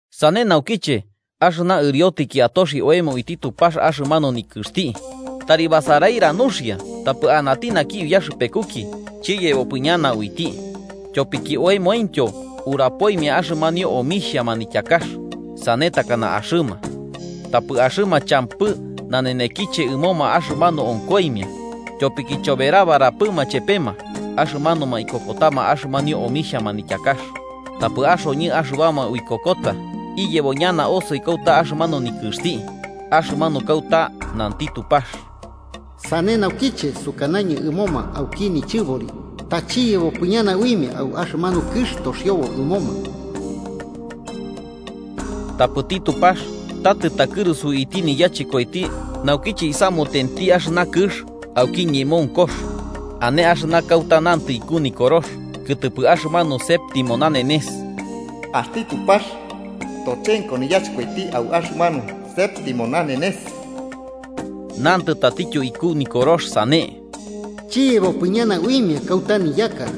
Sane naukiche, axɨna ɨriotɨki atoxi oemo uiti Tupax axɨmanu nikɨxti, tari basarira nuxia tapɨ anati naki uyaxɨpekuki chiyebopɨ ñana uiti. Tyopiki oemointyo urapoimia axɨmanio omixhia manityakax, sane takana axɨma. Tapɨ axɨma champɨ nanenekiche ɨmoma axɨmanu onkoimia, tyopiki choberabarapɨma chepema axɨmanuma ikokotama axɨmanio omixhia manityakax. Tapɨ axoñɨ axɨbama uikokota, iyebo ñana osoi kauta axɨmanu nikɨxti, axɨmanu kauta nanti Tupax: “Sane naukiche sukanañɨ ɨmoma auki nichɨbori ta chiyebopɨ ñana uimia au axɨmanu kɨx toxiobo ɨmoma.” Tapɨti Tupax ta tɨtakɨrusu uiti niyachɨkoiti naukiche isamutenti axɨna kɨx auki ñemonkox. Ane axɨna kauta nantɨ iku Nikorox kɨtɨpɨ axɨmanu séptimo nanenes: “Axti Tupax tochenko niyachɨkoiti au axɨmanu séptimo nanenes.” Nantɨ tatityo iku Nikorox sane: “Chiyebopɨ ñana uimia kauta niyaka.”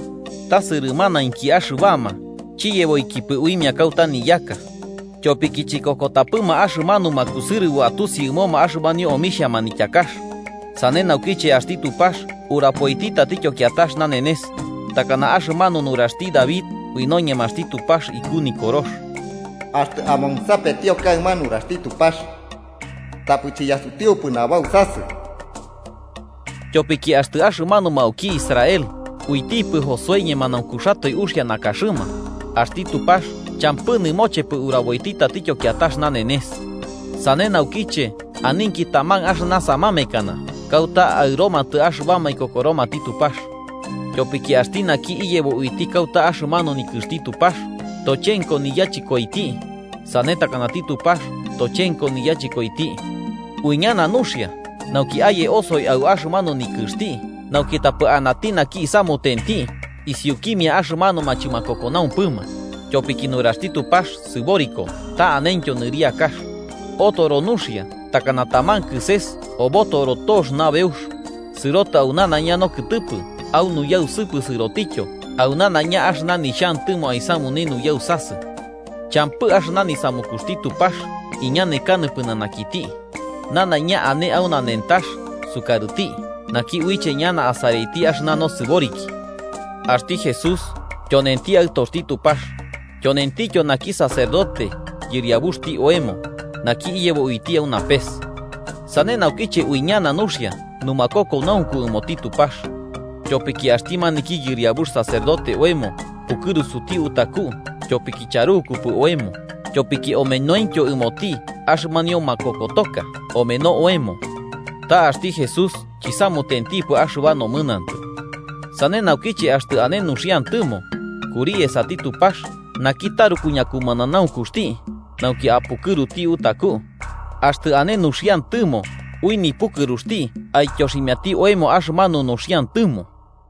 Ta sɨrɨmanamainki axɨbama chiyeboikipɨ uimia kauta niyaka, tyopiki chikokotapɨma axɨmanuma kusɨrɨboma atusi ɨmoma axɨmanio omixhia manityakax. Sane naukiche, axti Tupax urapoiti tatityo kiatax nanenes, takana axɨmanu nuraxti David ui noñemaxti Tupax iku Nikorox: “Axtɨ amonsapetio kaɨma nuraxti Tupax, tapɨ chiyasutiupɨ nabausasɨ.” Tyopiki axtɨ axɨmanuma auki Israel, uitipɨ Josué ñemanaunkuxatoe uxia nakaxɨma, axti Tupax champɨ nɨmochepɨ uraboiti tatityo kiatax nanenes. Sane naukiche aninki taman axɨna samamekana kauta aɨromatɨ axɨbama ikokoromati Tupax. Tyopiki axti naki iyebo uiti kauta axɨmanu nikɨxti Tupax, tochenko niyachɨkoiti, sane takanati Tupax tochenko niyachɨkoiti. Uiñana nuxia, nauki aye osoi au axɨmanu nikɨxti, nauki tapɨ anati naki isamutenti isiukimia axɨmanuma chɨmakokonaumpɨma. Tyopiki nuraxti Tupax sɨboriko ta anentyo nɨriakax. Otoro nuxia takana taman kɨses obotoro tox nabeux, sɨrotɨ au nanaiña nokɨtɨpɨ au nuyausɨpɨ sɨrotityo au nanaiña axɨna nixhantɨmo aisamune nuyausasɨ. Champɨ axɨna nisamukuxti Tupax iñanekanɨ pɨnanakiti. Nanaiña ane au nanentax sukarɨti naki uiche ñana asaraiti axɨna nosɨboriki. Axti Jesús tyonenti Aɨtoxti Tupax, tyonentityo naki sacerdote Yɨriabuxti oemo, naki iyebo uiti au napes. Sane naukiche uiñana nuxia numakokonaunku ɨmoti Tupax. Tyopiki axti maniki Yɨriabux sacerdote oemo pukɨrusuti utaku tyopiki charukupɨ oemo, tyopiki omenointyo ɨmoti axɨmanio makokotoka omeno oemo. Ta axti Jesús chisamutentipɨ axɨba nomɨnantɨ. Sane naukiche axtɨ ane nuxiantɨmo, kuri esati Tupax naki taruku ñakumananaunkuxti, nauki apukɨruti utaku, axtɨ ane nuxiantɨmo ui nipukɨruxti aityoximiati oemo axɨmanu nuxiantɨmo.